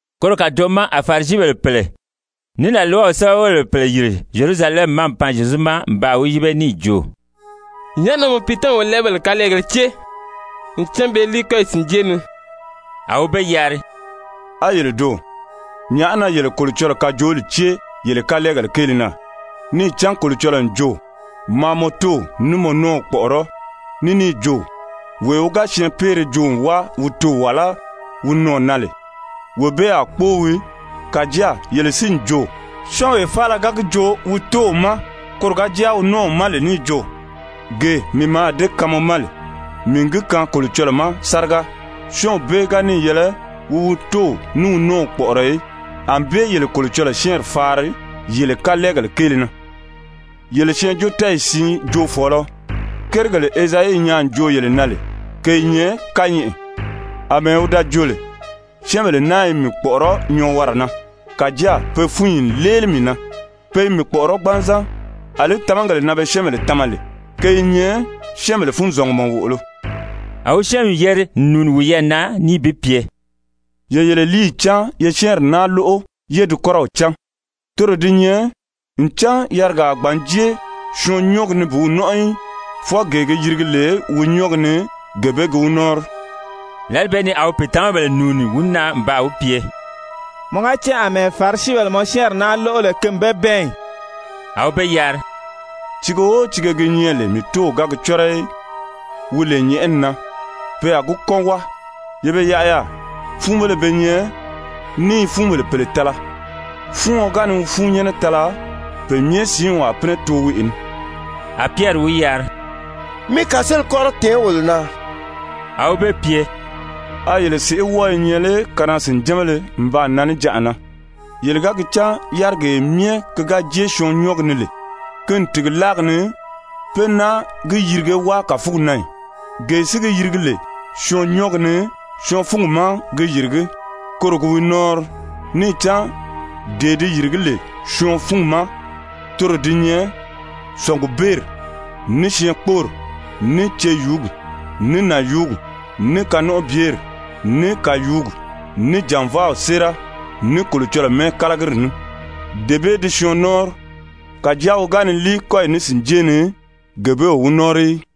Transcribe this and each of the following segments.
Koro kàdoʔo ma a Farisibèle pèle, ní làlwaw sɛ́bɛwelebèle pèle yìri Zyerusalɛmi ma n pan Zyezu ma n baa wi yíbe níì jo: «Nyàʔá na mɔ piitamabèle wolɛɛbèle kalɛɛgéle cée? Ncan pe i líi kɔ́yi sìnjée ni.» A wi be yari: «A yele doò? Nyàʔá na yele Kolocɔlɔɔ kajooli cée yele kalɛɛgèle kéele na? Níì cán Kolocɔlɔɔ n jo: ‹Maa mɔ tóow ní mɔ nɔ́ɔw kpɔ̀ʔɔrɔ́.› Ní níì jo: ‹Wee wi ga syɛɛnpeere joo n wáa wi toò wàlá wi nɔɔ̀ na lè, wee bee a kpóo wii.› Kàjáa yele si n jo: Syɔ́ɔnwee faala ga gi joo wi tóow ma, koro ga jáa wi nɔ́ɔw ma lè níì jo: ‹Gee mii mǎà dée kaan mɔ ma lè, mii n gi kaan Kolocɔlɔɔ ma sáriga,› syɔ́ɔnw bee ga níì yɛlɛ wi wi tóow ní wi nɔ́ɔw kpɔ̀ʔɔrɔ í. Anbée yele Kolocɔlɔɔ syɛ́ɛnri faari yele kalɛɛgèle kéele na. Yele syɛɛnjóotɛɛyi siin joofɔɔlɔ, kérigèle Ezayi nyaa n joo yele na lè, ke i nyɛ kányɛʔɛ, àmɛɛ wi da jo lè. ‹Syɛ́ɛnbèle naa i mii kpɔ̀ʔɔrɔ́ nyɔɔwara na, kàjáa pe fúnyi n léeli mii na. Pe i mii kpɔ̀ʔɔrɔ́ gbanzan. Alí tamagèle na be syɛ́ɛnbèle tama lè, ke i nyɛ syɛ́ɛnbèle funzɔngumɔ wòʔolo.›» A wi syɛ́ɛnmi yeri n nùuni wiyɛɛ na níì bi pye: «Ye yele líiyi cáan ye syɛ́ɛnri naa lóʔo yé di kɔ́rɔw cán. Toro di nyɛ ncan yarigaa a gbǎn jée syɔɔn nyɔ́ɔgi ni bi wi nɔ́nʔɔ í. Fwɔɔ gee gi yirigi lè wi nyɔ́ɔgi ni, gee bee gi wi nɔ́ɔnri.» Lǎli bee ni a pìitamabèle nùuni wi na n baa wi pye: «Mɔ ga cán àmɛɛ Farisibèle mɔ syɛ́ɛnri naa lóʔo lè ki n be bɛɛn ì?» A wi be yari: «Tiige o tiige gi nyɛ lè mii Tóow ga gi cɔ́rɔ í, wi lè nyɛ̀ʔɛni na, pe a gi kɔ́n wáa. Ye be yaʔa yaà, fúunbéle be nyɛ, ní i fúunbèle pèle tala. Fúuɔn ga ni wi fúunnyɛnnɛ tala, pe myɛ siinw a pínɛ too weʔe ni.» A Pyɛri wi yari: «Mi kàseeli kɔ́rɔ tɛ̀ɛn wolo na.» A wi be pye: «A yele sèʔé wɔ́ɔ i nyɛ lé kanaa-sìnjánbéle n baa nan níjanʔa na? Yele ga gi cán yárigee myɛ ki ga jée syɔɔ nyɔ́ɔgi ni lè, ki n tìgi láagi ni pé náa gi yirige wáa kàfugi na ì? Gee si gi yirigi lè syɔɔn nyɔ́ɔgi ni, syɔɔn fúngi ma gi yìrigí. Koro gi wi nɔ́ɔnri. Níì cán dee di yìrigí lè syɔɔn fúngi ma, toro di nyɛ sɔ̀ngubeeri, ní syɛɛnkpoori, ní ceyuugi, ní nànyuugi, ní kanɔnʔɔbyeri, ní kàyuugi, ní jànvaaw séera, ní Kolocɔlɔɔ mɛ́ɛkalagiri ní, dee bee di syɔɔn nɔ́ɔnri. Kàjáa wi ga ni líi kɔ́yi ní sìnjée ni, gee bee o wi nɔ́ɔnri í.»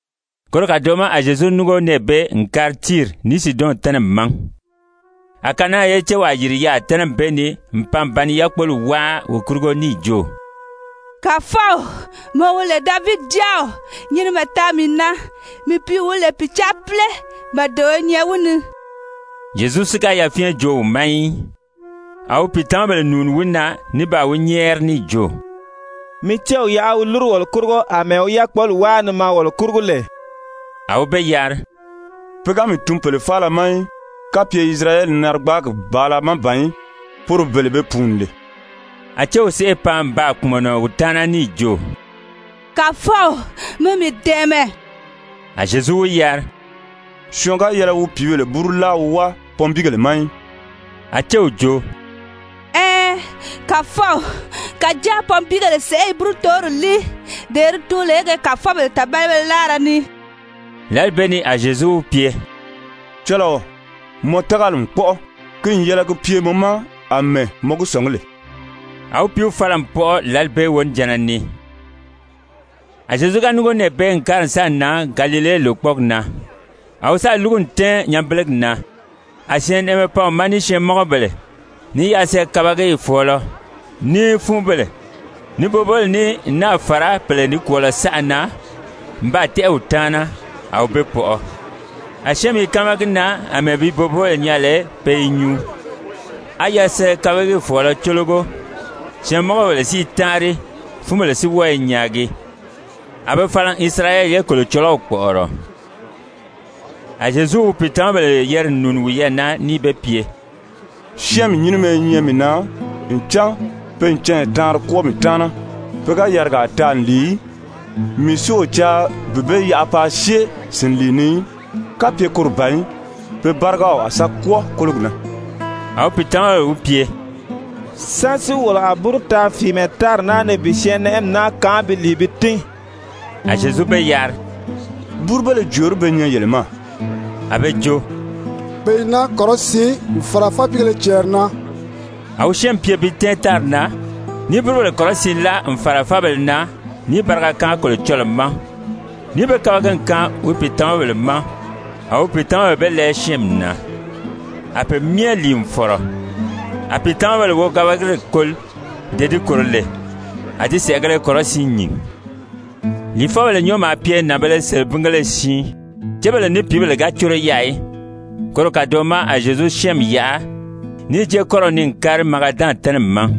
Koro kàdoʔo ma a Zyezu núngo nɛɛ bee n kári Tiiri ní Siidɔn tɛ́nɛmi ma. A Kanaan ye céwaa yìri yaà tɛ́nɛmi bee ni n pan n ba ni yákpoli wáa wi kurugo níì jo: «Kàfɔw, mɔ wi lè Davidi Jáaw, nyinimɛ taa mii na. Mii pìíw wi lè pìcaapile, màdebeeo i nyɛ wi ni.» Zyezu si ga yafyɛn joo wi ma í. A wi pìitamabèle nùuni wi na ní baa wi nyɛ́ɛri níì jo: «Mi céw yaʔa wi lúru wolo kurugo àmɛɛ wi yákpoli wáa ni maa wolo kurugo lè.» A wi be yari: «Pe ga mii tun pèle faala ma í, kapye Isirayɛli narigbaagi bàala má ban í, poro bele be pùuni lè.» A céw sèʔê pan n baa kpùmɔnɔ wi taana níì jo: «Kàfɔw, mi mii dɛ̀ɛmɛ.» A Zyezu wi yari: «Syɔɔn ga yɛlɛ wi pìíbèle búru láa wi wáa pɔnbiigèle ma í.» A céw jo: «Ɛɛn, Kàfɔw, kàjáa pɔnbiigèle sèʔé i búrutoori líi, dee di tuun lè ge kàfɔbèle tàbalibéle láara ni.» Lǎli bee ni a Zyezu wi pye: «Cɔlɔɔ, mɔ tágali n kpɔ́ʔɔ. Ki n yɛlɛ ki pye mɔ ma àmɛɛ mɔ gi sɔ̀ngí lè.» A wi pìíw fala n pɔʔɔ lǎli bee wonijanna ni. A Zyezu ga núngo nɛɛ bee n kári n sáà nan Galile lòkpɔɔgi na, a wi sáà lúgu n tɛ́ɛn nyanbelegi na. A syɛɛnnɛʔɛmɛ pan wi ma ní syɛɛnmɔngɔbèle, ní yasɛɛ-kabagiyi fɔ̀ɔlɔ, ní fúunbèle, ní boboobèle ní n náà fàra pèle nikwɔɔlɔ saʔa na n baa tɛ́ʔɛ wi taana, a wi be pɔʔɔ. A syɛ́ɛnmi i káama gi na àmɛɛ bi boboobèle nyaa lè pe i nyuu, á yasɛɛ-kabagiyi fɔ̀ɔlɔ cólogo, syɛɛnmɔngɔbèle si i táanri, fúunbèle si wɔ́ɔ i nyaagi. A be fala n Isirayɛli ye Kolocɔlɔw kpɔ̀ʔɔrɔ. A Zyezu wi pìitamabèle yeri n nùuni wiyɛɛ na níì be pye: «Syɛ́ɛnmi nyínimɛ i nyɛ mii na ncan pe n canya taanri kwɔ́ɔ mii taana. Pe ga yarigaa taa n lìi í. Mii si o caa bi be yaʔa paa syée sìnlii ni í. Kapye koro ban í, pe bárigaw a sa kwɔ́ɔ kólogi na.» A wi pìitamabèle wi pye: «Sán si wolo a búru taa fìimɛ tári naa ni bi syɛɛnnɛʔɛmi naa kaan bi lìi bi tín?» A Zyezu be yari: «Búrubéle jòorí be nyɛ yele ma?» A be jo: «Pe i naa kɔrɔsiin n fàra fápiigéle cɛɛri na.» A wi syɛ́ɛnmi pye bi tɛ́ɛn tári na, níì búrubèle kɔrɔsiin láa n fàra fábèle na níì bariga kaan Kolocɔlɔɔ ma, níì be kabagi n kaan wi pìitamabèle ma, a wi pìitamabèle be lɛɛ syɛ́ɛnmi na. A pe myɛ lìi n fɔ̀rɔ, a pìitamabèle wogabagiri koli dee di kòro lè, a di sɛ̀ʔɛgēle kɔrɔsiin nyìn. Lìifɔbèle nyɔ́ɔ maa pye nànbēle selebingéle siin, cébèle ní pìíbèle ga córo yaà í. Koro kàdoʔo ma a Zyezu syɛ́ɛnmi yaʔa, níì jée kɔ́rɔw ni n kári Magadan tɛ́nɛmi ma.